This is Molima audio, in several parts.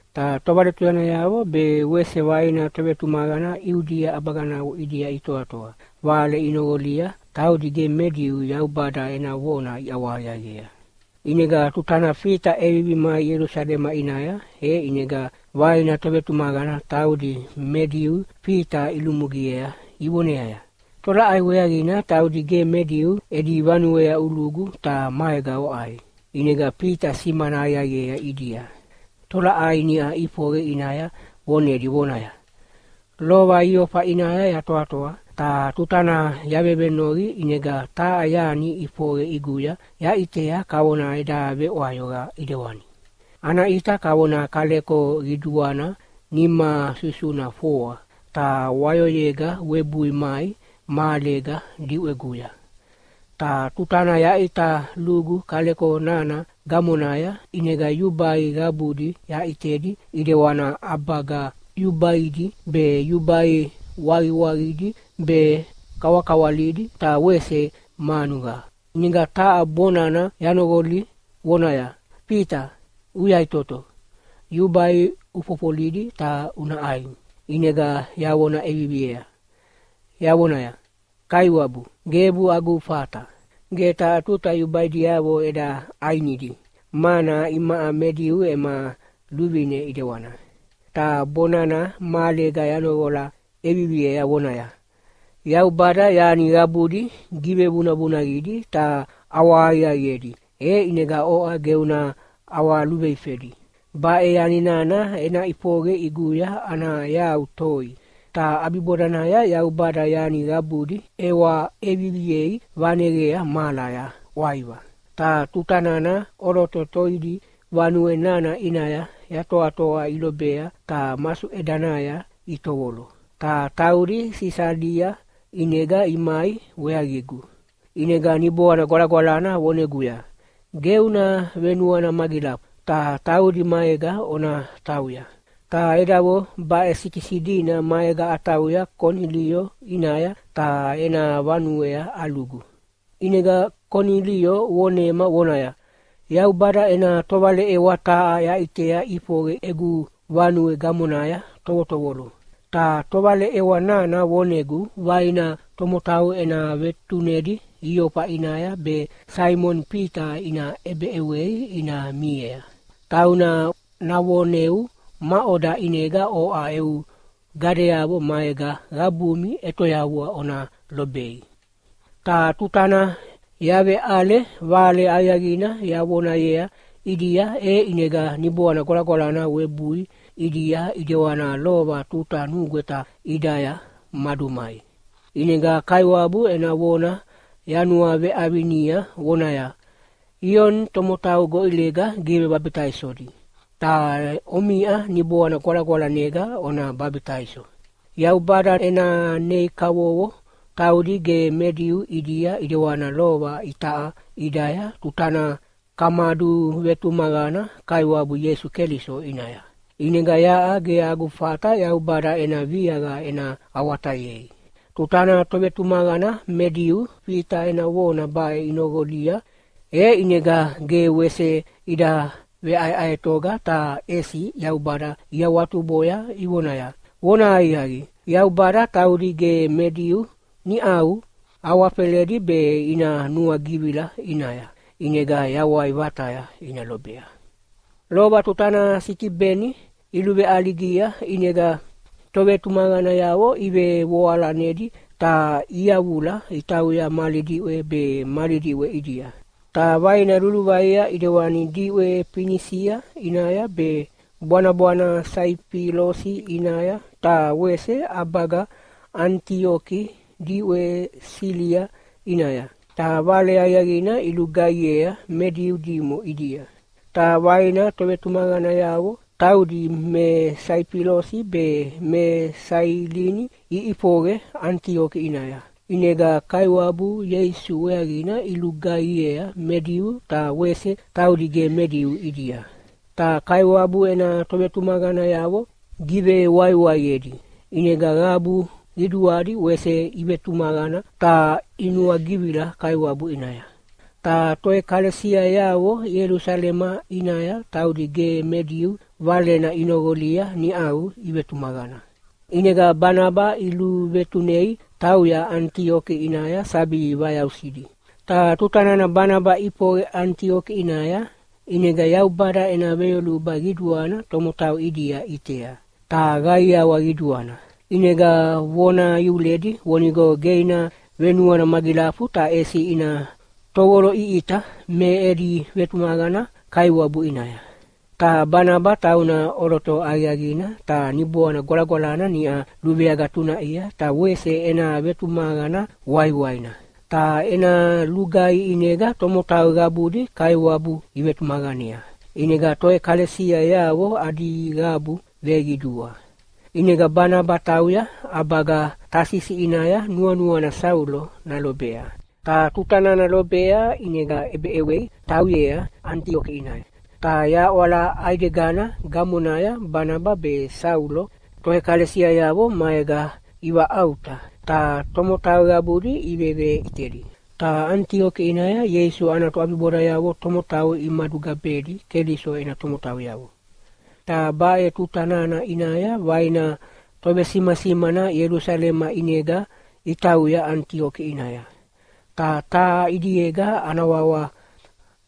Ta tovaletuyanayavo be wese vaina tovetumaqana Iudia ʼabaganavo ʼidia itoatoa, vale inoqolia taudi ge me Diu Yaubada ena vona iʼawahaqiaqiea. ʼInega tutana Fita ʼevivi mai Ielusalema ʼinaya, e ʼinega vaina tovetumaqana taudi me Diu Fita ilumugiea ivoneaya, “Tolaʼai weaqina taudi ge me Diu edi vanuea ulugu ta maega oʼai?” ʼInega Fita simana aqiaqiea ʼidia tolaʼai niʼa ʼifoqe ʼinaya vonedi vonaya, “Lova Iofa ʼinaya yatoatoa, ta tutana yavevenoqi ʼinega taha yani ʼifoqe ʼiguya yaʼitea kavona eda veʼwayoqa ʼedewani. Ana ʼita kavona kaleko qiduana nima susuna foa, ta wayoyega webui mai mahalega diʼweguya. Ta tutana yaʼita lugu kaleko nana gamonaya, ʼinega yubai qabudi yaʼitedi ʼidewana ʼabaga yubaidi be yubai waqiwaqidi be kawakawalidi ta wese manuqa. ʼInega taha bonana yanoqoli vonaya, ‘Fita, uyaʼitoto! Yubai ufofolidi ta una ʼai!’ “ʼInega yavona ʼeviviea yavonaya, ‘Kaiwabu, gebu agu fata! Ge taha tuta yubaidiavo eda ʼainidi, mana imaʼa me Diu ema luvine ʼidewana.’ “Ta bonana mahalega yanoqola ʼeviviea vonaya, ‘Yaubada yani qabudi givevunavunaqidi ta ʼawahaqiaqiedi, e ʼinega oʼa ge una ʼawaluveifedi.’ Baʼe yani nana ena ʼifoqe ʼiguya ana yau toi, ta ʼabibodanaya Yaubada yani qabudi ʼewa ʼeviviei vaneqea mahalaya ʼwaiva. Ta tuta nana ʼoloto toidi vanue nana ʼinaya yatoatoa ilobea ta masuʼedanaya itovolo. Ta taudi Sisalia ʼinega imai weaqigu. “ʼInega Niboana Gwalagwalana voneguya, ‘Ge una venuana magilafu, ta taudi maega ona tauya.’ Ta edavo baʼe sikisi dina maega atauya Konilio ʼinaya ta ena vanuea alugu. ʼInega Konilio vonema vonaya, ‘Yaubada ena tovaleʼewa taha yaʼitea ʼifoqe egu vanue gamonaya tovotovolo. Ta tovaleʼewa nana vonegu vaina tomotau ena vetunedi Iofa ʼinaya be Saimoni Fita ina ʼebeʼewei ina miea. Tauna navoneu maʼoda ʼinega oʼa eu gadeavo maega qabumi ʼetoyavua ona lobei.’ “Ta tutana yaveʼale Vale Aqiaqina yavonayea ʼidia e ʼinega Niboana Gwalagwalana webui ʼidia ʼidewana lova tuta nugweta ʼidaya madumai. ʼInega Kaiwabu ena vona yanuaveʼavinia vonaya, ‘Ioni tomotau goʼilega givebabitaisodi, ta omiʼa Niboana Gwalagwalanega ona babitaiso.’ Yaubada ena nei kavovo taudi ge me Diu ʼidia ʼidewana lova itaʼa ʼidaya tutana kamaduvetumaqana Kaiwabu Ieisu Keliso ʼinaya. ʼInega yaʼa ge agu fata Yaubada ena viaqa ena awatayei.” Tutana tovetumaqana me Diu Fita ena vona baʼe inoqolia, e ʼinega ge wese ida veʼaeʼaetoga ta ʼesi Yaubada iawatuboya ivonaya, “Vonahaqiaqi, Yaubada taudi ge me Diu niʼau awafeledi be ina nuagivila ʼinaya, ʼinega yawai vataya ina lobea.” Lova tutana Sitibeni iluveʼaligia ʼinega tovetumaqanayavo ivevoalanedi ta iyavula itauya mali diʼwe be mali diʼwe ʼidia, ta vaina luluvaia ʼidewani diʼwe Finisia ʼinaya be bwanabwana Saifilosi ʼinaya ta wese ʼabaga Anitioki diʼwe Silia ʼinaya. Ta Vale Aqiaqina ilugaihiea me Diu dimo ʼidia. Ta vaina tovetumaqanayavo, taudi me Saifilosi be me Sailini iʼifoqe Anitioki ʼinaya, ʼinega Kaiwabu Ieisu weaqina ilugaihiea me Diu ta wese taudi ge me Diu ʼidia. Ta Kaiwabu ena tovetumaqanayavo givewaiwaiedi, ʼinega qabu qiduadi wese ivetumaqana ta inuagivila Kaiwabu ʼinaya. Ta toʼekalesiayavo Ielusalema ʼinaya taudi ge me Diu valena inoqolia niʼau ivetumaqana. ʼInega Banaba iluvetunei tauya Anitioki ʼinaya sabi vayausidi. Ta tuta nana Banaba ʼifoqe Anitioki ʼinaya, ʼinega Yaubada ena veyoluba qiduana tomotau ʼidia ʼitea, ta qaiawa qiduana. ʼInega vona iuledi vonigo ge ina venuana magilafu ta ʼesi ina tovoloʼiʼita me edi vetumaqana Kaiwabu ʼinaya. Ta Banaba tauna ʼoloto aqiaqina ta Niboana Gwalagwalana niʼa luveagatunaʼia ta wese ena vetumaqana waiwaina. Ta ena lugaihi ʼinega tomotau qabudi Kaiwabu ivetumaqanea, ʼinega toʼekalesiayavo adi qabu veqidua. ʼInega Banaba tauya ʼabaga Tasisi ʼinaya nuanuana Saulo nalobea. Ta tuta nana lobea ʼinega ʼebeʼewei tauyea Anitioki ʼinaya. Ta yaʼwala ʼaidegana gamonaya Banaba be Saulo toʼekalesiayavo maega ivaʼauta, ta tomotau qabudi iveveʼitedi. Ta Anitioki ʼinaya Ieisu ana toʼabibodayavo tomotau imadugabedi Keliso ena tomotauyavo. Ta baʼe tuta nana ʼinaya vaina tovesimasimana Ielusalema ʼinega itauya Anitioki ʼinaya. Ta taha ʼidiega ana wawa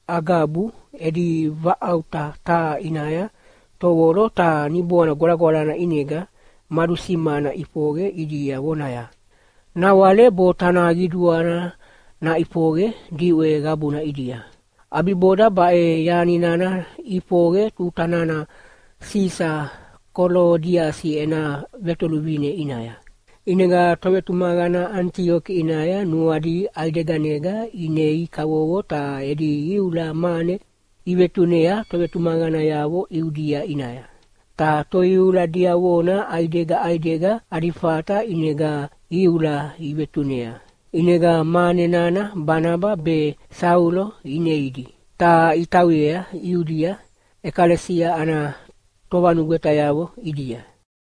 Agabu edi vaʼauta taha ʼinaya tovolo ta Niboana Gwalagwalana ʼinega madusimana ʼifoqe ʼidia vonaya, “Nawale botana qiduana naʼifoqe diʼwe qabuna ʼidia.” (ʼAbiboda baʼe yani nana ʼifoqe tuta nana Sisa Kolodiasi ena vetoluvine ʼinaya.) ʼInega tovetumaqana Anitioki ʼinaya nuadi ʼaideganega inei kavovo ta edi iula mane ivetunea tovetumaqanayavo Iudia ʼinaya. Ta toiula diavona ʼaidega ʼaidega adi fata ʼinega iula ivetunea. ʼInega mane nana Banaba be Saulo ineidi, ta itauyea Iudia ʼekalesia ana tovanugwetayavo ʼidia.